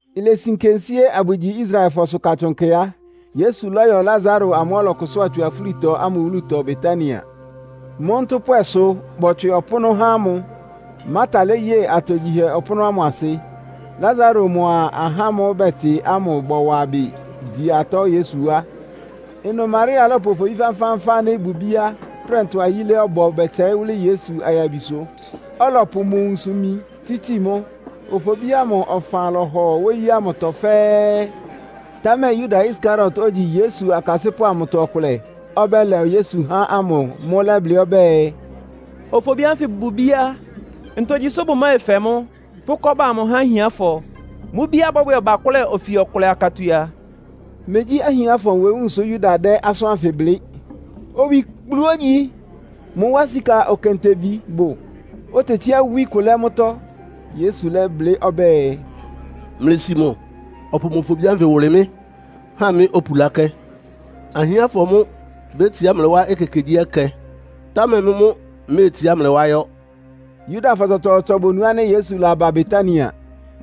Ilesi nkensíé abʋgyi Israelfɔsʋ Katsʋn Nkɛ a, Yesu lɔ́yɔ Lasaro amʋ́ʋ́ ɔlɔkʋsʋ́a tsu afúlitɔ ámʋ wúlutɔ Betania. Mʋ́ ntʋ́pwɛsʋ bɔtswɩ ɔpʋ́nʋ́ há mʋ. Marta léye atogyihɛ ɔpʋ́nʋ́ ámʋ asɩ. Lasaro mʋa ahá ámʋ́ʋ́ bɛtɩ ámʋ bɔwa ɩbɩ gyi atɔ́ Yesu wá. Ɩnʋ Maria lɔ́pʋ ofobí fánfáánfán ánɩ́ ɩbʋ ibíá prɛntʋa yílé ɔbɔ bɛtsɛɩ́ wʋ́lɩ́ Yesu ayabisʋ, ɔlɔpʋ mʋ nwunsʋ-imi tsítsi mʋ́. Ofobí ámʋ ɔfan lɔhɔ wóyí ámʋtɔ fɛ́ɛ́. Támɛ Yuda Iskariot, ogyi Yesu akasɩ́pʋ́ amʋtɔ ɔkʋlɛ, ɔbɛ́lɛ Yesu há ámʋ mʋ́ lɛ́blɩ́ ɔbɛ́ɛ, “Ofobí ánfɩ bʋ bíá. Ntogyi sʋ́ bʋmɛfɛ mʋ́, pʋ́ kɔ́ba amʋ há ahiánfɔ? Mʋ́ bíá bɔ́bwɛ ɔbakʋ́lɛ ofi ɔkʋlɛ akatua.” Megyí ahiánfɔ nwewúun sʋ Yuda dɛ́ asʋ́n ánfɩ blɩ́. Owikplu ógyi sʋ. Mʋ wá sika okentebi bʋ, otetsíá wí kʋ lɛ́ mʋ́tɔ́. Yesu lɛ́blɩ́ ɔbɛ́ɛ, “Mlɩsi mʋ ɔpʋ ofobí ánfɩ wʋlɩ mɩ́ ha mɩ́ opulákɛ́. Ahiánfɔ mʋ́ bétsiá mlɩ wá ekekegyíɛkɛ, támɛ mɩ́ mʋ́ mméetsiá mlɩ wá yɔ́.” Yudafɔ tsɔtsɔɔtsɔ bonu ánɩ́ Yesu laba Betania.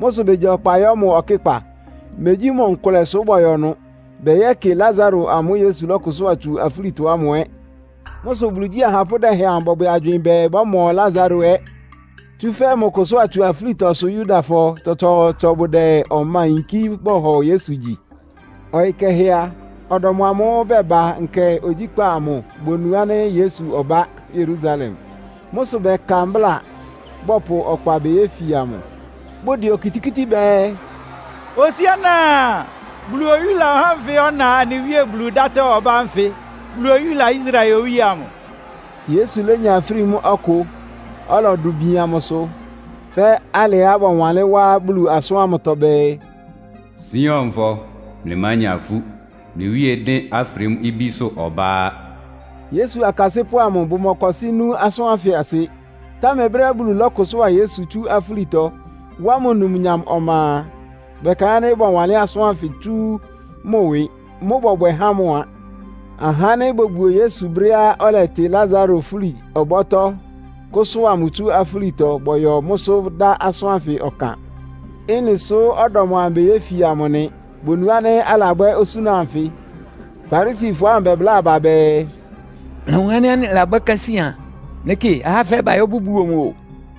Mʋ́ sʋ begya ɔkpa yɔ́ mʋ ɔkɩ́kpa. Megyí mʋ nkʋlɛ sʋ bɔyɔ́ ɩnʋ. Bɛyɛ́kɩ Lasaro amʋ́ʋ́ Yesu lɔ́kʋsʋ́a tsu afúlitɔ ámʋ ɛ́. Mʋ́ sʋ Bulu igyí ahapʋ́ dɛhɛn amʋ bɔbwɛ agywɩɩn bɛɛ bɔ́mɔ Lasaro ɛ́. Tsúfɛ́ mʋ kʋsʋ́a tsu afúlitɔ sʋ Yudafɔ tsɔtsɔɔtsɔ bʋdɛ ɔma yinkí bɔhɔ Yesu gyi. Ɔyɩ kɛhɛ a, ɔdɔm amʋ́ʋ́ baba nkɛ ogyíkpá amʋ bonu ánɩ́ Yesu ɔbá Yerusalem. Mʋ́ sʋ bɛka mbláa, bɔpʋ ɔkpa beyéfia mʋ. Bʋdɛ okitikíti bɛɛ, “Hosiána! Bulu oyúla ɔhá anfɩ́ ɔna anɩ Wíe Bulu dátɔ́ ɔbá ánfɩ! Bulu oyúla Israel Owíe amʋ!” Yesu lénya afrímú ɔkʋ, ɔlɔdʋ bian mʋsʋ, fɛ́ alɩá bɔwanlɩ́n wá Bulu asʋ́ntɔ́ bɛɛ, “Sionfɔ, mlɩmánya ifú! Mlɩ Wíe dɩ́n afrímú ibísʋ́ ɔbá á!” Yesu akasɩ́pʋ́ amʋ bʋmɔkɔsɩ́ nú asʋ́n ánfɩ asɩ. Támɛ brɛ́á Bulu lɔ́kʋsʋ́a Yesu tsú afúlitɔ, wá mʋ numnyam ɔma a, bɛkaɩ́n ánɩ́ bɔwanlɩ́n asʋ́n ánfɩ tsú mʋ ɩwɩ. Mʋ́ bɔbwɛ há mʋ a. Aha ánɩ́ bobuo Yesu brɛ́á ɔlɛtɩ Lasaro fúli-ɔbɔ́tɔ́, kʋ́sʋ́a mʋ tsú afúlitɔ bɔyɔ mʋ́sʋ́ dá asʋ́n ánfɩ ɔkan. Ɩ́nɩ sʋ ɔdɔm amʋ beyéfia mʋ nɩ. Bonu ánɩ́ alabwɛ́ osúna anfɩ. Farisifɔ amʋ bɛbláa aba bɛɛ, “Mlɩlawun ánɩ́ anɩlabwɛ́ kásíán. Mlɩkɩ, ahá fɛɛ bayɔ́ bʋbuo mʋ o!”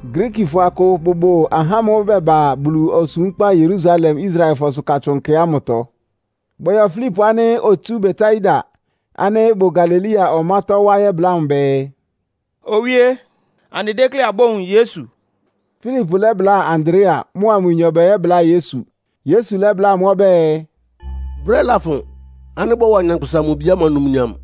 Griikifɔ akʋ bʋbʋ ahá ámʋ́ʋ́ bɛba Bulu osúmkpá Yerusalem Israelfɔsʋ Katsʋn Nkɛ ámʋtɔ. Bɔyɔ Filipo ánɩ́ otsu Betsaida ánɩ́ ɩbʋ Galilea ɔmátɔ́ wá yɛ́bláa mʋ bɛɛ, “Owíé, anɩdékléá abówun Yesu.” Filipo lɛ́bláa Andrea, mʋa mʋnyɔ bɛyɛ́bláa Yesu. Yesu lɛ́bláa amʋ́ ɔbɛ́ɛ, “Brɛ́ lafʋn ánɩ́ bɔ́wa Nyankpʋsa-Mʋ-Bi ámʋ numnyam.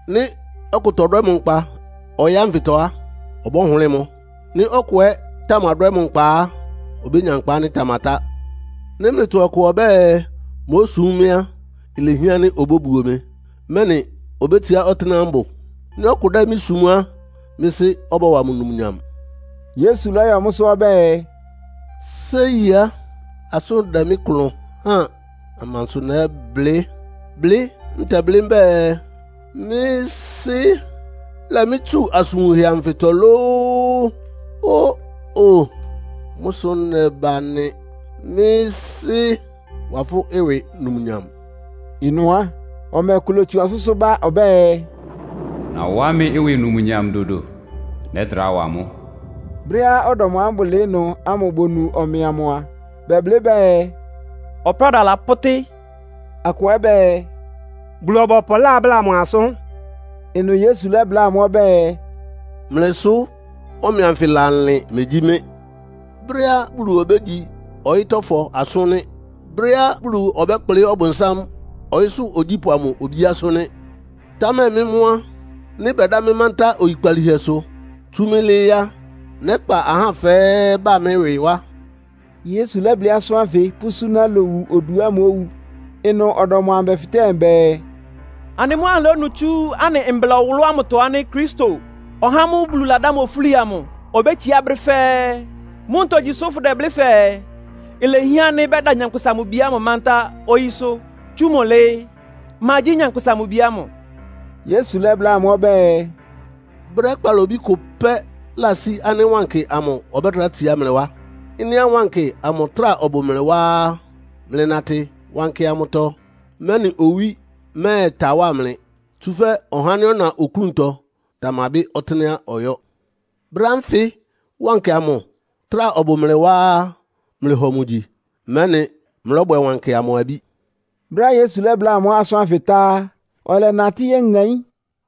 Nɩ́ ɔkʋ tɔdwɛ́ mʋ nkpa ɔyɩ́ ánfɩtɔ á, ɔbɔ́hʋlɩ́ɩ mʋ́. Nɩ́ ɔkʋ ɛ́ tamadwɛ́ mʋ nkpa á, obénya nkpa ánɩ́ ɩtamatá. Nɩ́ mlɩtɔ ɔkʋ ɔbɛ́ɛ mósum mɩ́ á, ilehián ánɩ́ obóbuo mɩ, mɛ́nɩ obétsiá ɔtɩ́nɛ́á mbʋ. Nɩ́ ɔkʋ dɛ́ mɩ́ sum á, mɩ́ Sɩ́ ɔbɔ́wa mʋ numnyam.” Yesu lɔ́yɔ mʋ́sʋ́ ɔbɛ́ɛ, “Séi á, asʋ́n dɛ́ mɩ́ klʋn háan! Amansʋ nɛ́blɩ́? Blɩ́ ntɛblɩ́ mbɛ́ɛ, Mɩ́ Sɩ́, lɛ mɩ́ tsu asʋn wunhɛ anfɩtɔ lóó? Ó-o, mʋ́ sʋ nɛba nɩ. Mɩ́ Sɩ́, wa fʋ́ ɩwɩ numnyam!” Ɩnʋ á, ɔmɛ ɔkʋ lótsu ɔsʋ́sʋ́ ba ɔbɛ́ɛ, “Nawá mɩ́ ɩwɩ numnyam dodo. Nɛ́trá wa mʋ́.” Brɛ́á ɔdɔm amʋ́ʋ́ bʋlɩɩ́ ɩnʋ ámʋ bonu ɔmɛ amʋ a, bɛblɩ́ bɛɛ “Ɔpráda lapʋ́tɩ́.” Akʋ ɛ́ bɛɛ, “Bulu-ɔbɔpʋ lábláa mʋ asʋ́n!” Ɩnʋ Yesu lɛ́bláa amʋ́ ɔbɛ́ɛ, “Mlɩ sʋ ɔmɛ anfɩ lalɩn, megyí mɩ́. Brɛ́á Bulu obégyi ɔyɩ́tɔ́fɔ asʋ́n nɩ́. Brɛ́á Bulu ɔbɛ́kplɩ́ Ɔbʋnsám, ɔyɩ́sʋ́ ogyípʋ́ amʋ obíásʋ́ nɩ́. Támɛ mɩ́ mʋ́ á, nɩ́ bɛdá mɩ́ mántá oyikpalíhɛsʋ, tsú mʋ́ lɩ́ɩ́ á, nɛ́kpa ahá fɛ́ɛ́ ba mɩ́ ɩwɩ wá.” (Yesu lɛ́blɩ́ asʋ́n ánfɩ pʋ́súná lowu oduá mówu.) Ɩnʋ ɔdɔm amʋ bɛfɩtɛ́ mʋ bɛɛ, “Anɩ mʋ́ anɩlónu tsú anɩ Mbla ɔwʋlʋ́ ámʋtɔ ánɩ́ Kristo, (ɔhá ámʋ́ʋ́ Bulu ladá mʋ ofúli amʋ) obétsiá brɛ́ fɛ́ɛ́. Mʋ́ ntogyi sʋ fʋ́dɛblɩ́ fɛɛ, ilehián ánɩ́ bɛdá Nyankpʋsa-Mʋ-Bi ámʋ mántá oyísʋ́, tsú mʋ́ lɩ́ɩ́? Ma gyí Nyankpʋsa-Mʋ-Bi ámʋ?” Yesu lɛ́bláa amʋ́ ɔbɛ́ɛ, “Brɛ́ kpalobí kʋ pɛ́ ɩlasí ánɩ́ Wankɩ amʋ ɔbɛ́trá tsiá mlɩ wá. Ɩ́nɩá Wankɩ amʋ trá ɔbʋ mlɩ wá á, mlɩnatɩ wankɩ amʋtɔ, mɛ́nɩ owí mɛ́ɛta wá mlɩ. Tsúfɛ́ ɔhá ánɩ́ ɔna oklúntɔ tamabɩ́ ɔtɩnɛ́á ɔyɔ́. Brɛ́ ánfɩ wankɩ amʋ trá ɔbʋ mlɩ wá á, mlɩhɔ mʋ gyi, mɛ́nɩ mlɔ́bwɛ wankɩ amʋ abí.” Brɛ́á Yesu lɛ́bláa amʋ́ asʋn anfɩ tá á, ɔlɛnatɩ́ yéŋaín.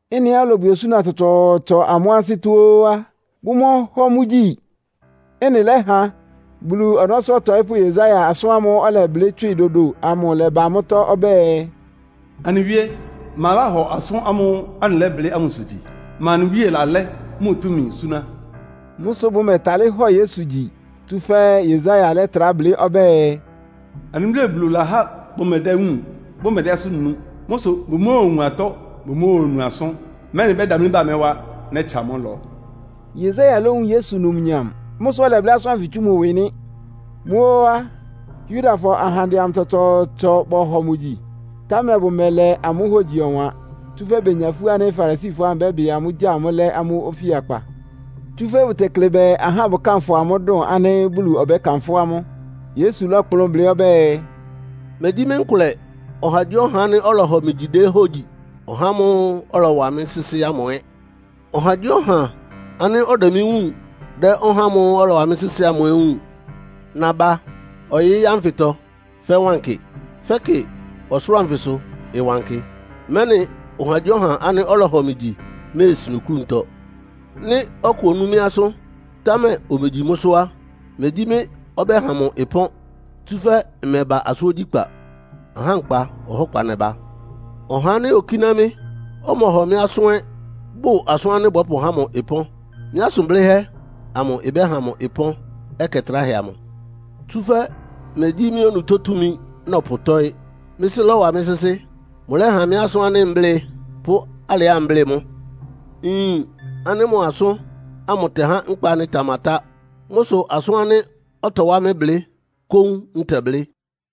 Ɩ́nɩá ɔlɔbwɛ osúna tsɔtsɔɔtsɔ amʋ́ ansɩ́tɔ́ ó á, bʋmɔhɔ mʋ gyi. Ɩ́nɩ lɛ́ha Bulu ɔnɔ́sʋ́ ɔtɔɩ́pʋ́ Yesaia asʋ́n ámʋ́ʋ́ ɔlɛblɩ́ tswɩ dodo amʋ lɛ́ba mʋ́tɔ́. Ɔbɛ́ɛ, “Anɩ Wíe, ma láhɔ asʋ́n ámʋ́ʋ́ anɩlɛ́blɩ́ ámʋsʋ gyi? Ma anɩ Wíe lalɛ́ mʋ túmi súná?” Mʋ́ sʋ bʋmɛtálɩ́ hɔ Yesu gyi, tsúfɛ́ Yesaia lɛ́trá blɩ́ ɔbɛ́ɛ, “Anɩ Wíe Bulu lahá bʋmedéwúun, bʋ́mɛdɛ́ asʋ́n nu, Mʋ́ sʋ bʋmóowun atɔ́, bʋmóonu asʋ́n, mɛ́nɩ bɛ́damlí ba mɩ́ wá, nɛ́tsa amʋ́ ɩlɔ.” Yesaia lówun Yesu numnyam. Mʋ́ sʋ ɔlɛblɩ́ asʋ́n ánfɩ tsú mʋ ɩwɩ nɩ́. Mʋ́ ó á, Yudafɔ ahandɛ amʋ tsɔtsɔɔtsɔ bɔhɔ mʋ gyi, támɛ bʋmɛlɛ amʋ́ hógyi ɔwan. Tsúfɛ́ benya ifú ánɩ́ Farisifɔ ámʋ bɛ́bɩ amʋ́, gya amʋ́ lɛ́ amʋ́ ofíakpa. Tsúfɛ́ bʋtekle bɛɛ ahá bʋkánfʋ amʋ́ dʋn ánɩ́ Bulu ɔbɛ́kanfʋ́ amʋ́. Yesu lɔ́kplʋn blɩ́ ɔbɛ́ɛ, “Megyí mɩ́ nkʋlɛ ɔhagyíɔha ánɩ́ ɔlɔhɔ mɩ gyi déhógyi. Ɔhá ámʋ́ʋ́ ɔlɔwa mɩ́ sɩ́sɩ́ ámʋ ɛ́. Ɔhagyíɔha ánɩ́ ɔdɛ mɩ́ wúun dɛ́ ɔhá ámʋ́ʋ́ ɔlɔwa mɩ́ sɩ́sɩ́ ámʋ ɛ́ wúun. Naba ɔyɩ́ ánfɩtɔ fɛ́ wankɩ, fɛ́kɩ ɔsʋlʋ́ʋ anfɩsʋ ɩwankɩ, mɛ́nɩ ɔhagyíɔha ánɩ́ ɔlɔhɔ mɩ gyi méesin oklúntɔ. Nɩ́ ɔkʋ onú mɩ́ asʋ́n, támɛ omegyi mʋ́sʋ́ á, megyí mɩ́ ɔbɛ́ha mʋ ɩpɔ́n. Tsúfɛ́ mmɛba asʋ́n ogyíkpá. Ahá nkpa ɔhɔ́kpa nɛba. Ɔha ánɩ́ okíná mɩ́, ɔmɔhɔ mɩ́ asʋ́n ɛ́ bʋ asʋ́n ánɩ́ bɔ́pʋhá mʋ ɩpɔ́n. Mɩ́ asʋn blɩ́hɛ́ amʋ ɩbɛ́ha mʋ ɩpɔ́n ɛkɛ tráhɛ amʋ. Tsúfɛ́ megyí mɩ́ onutó túmi nɔpʋtɔ́ɩ́. Mɩ́ Sɩ́ lɔ́wa mɩ́ sɩ́sɩ́. Mʋlɛ́ha mɩ́ asʋ́n ánɩ́ mblɩ́ɩ, pʋ́ alɩá mblɩ́ɩ mʋ́. Nyin ánɩ́ mʋ asʋ́n ámʋ ɩtɛhá nkpa ánɩ́ ɩtamatá. Mʋ́ sʋ asʋ́n ánɩ́ ɔtɔwá mɩ́ blɩ́ kóún ntɛblɩ́.”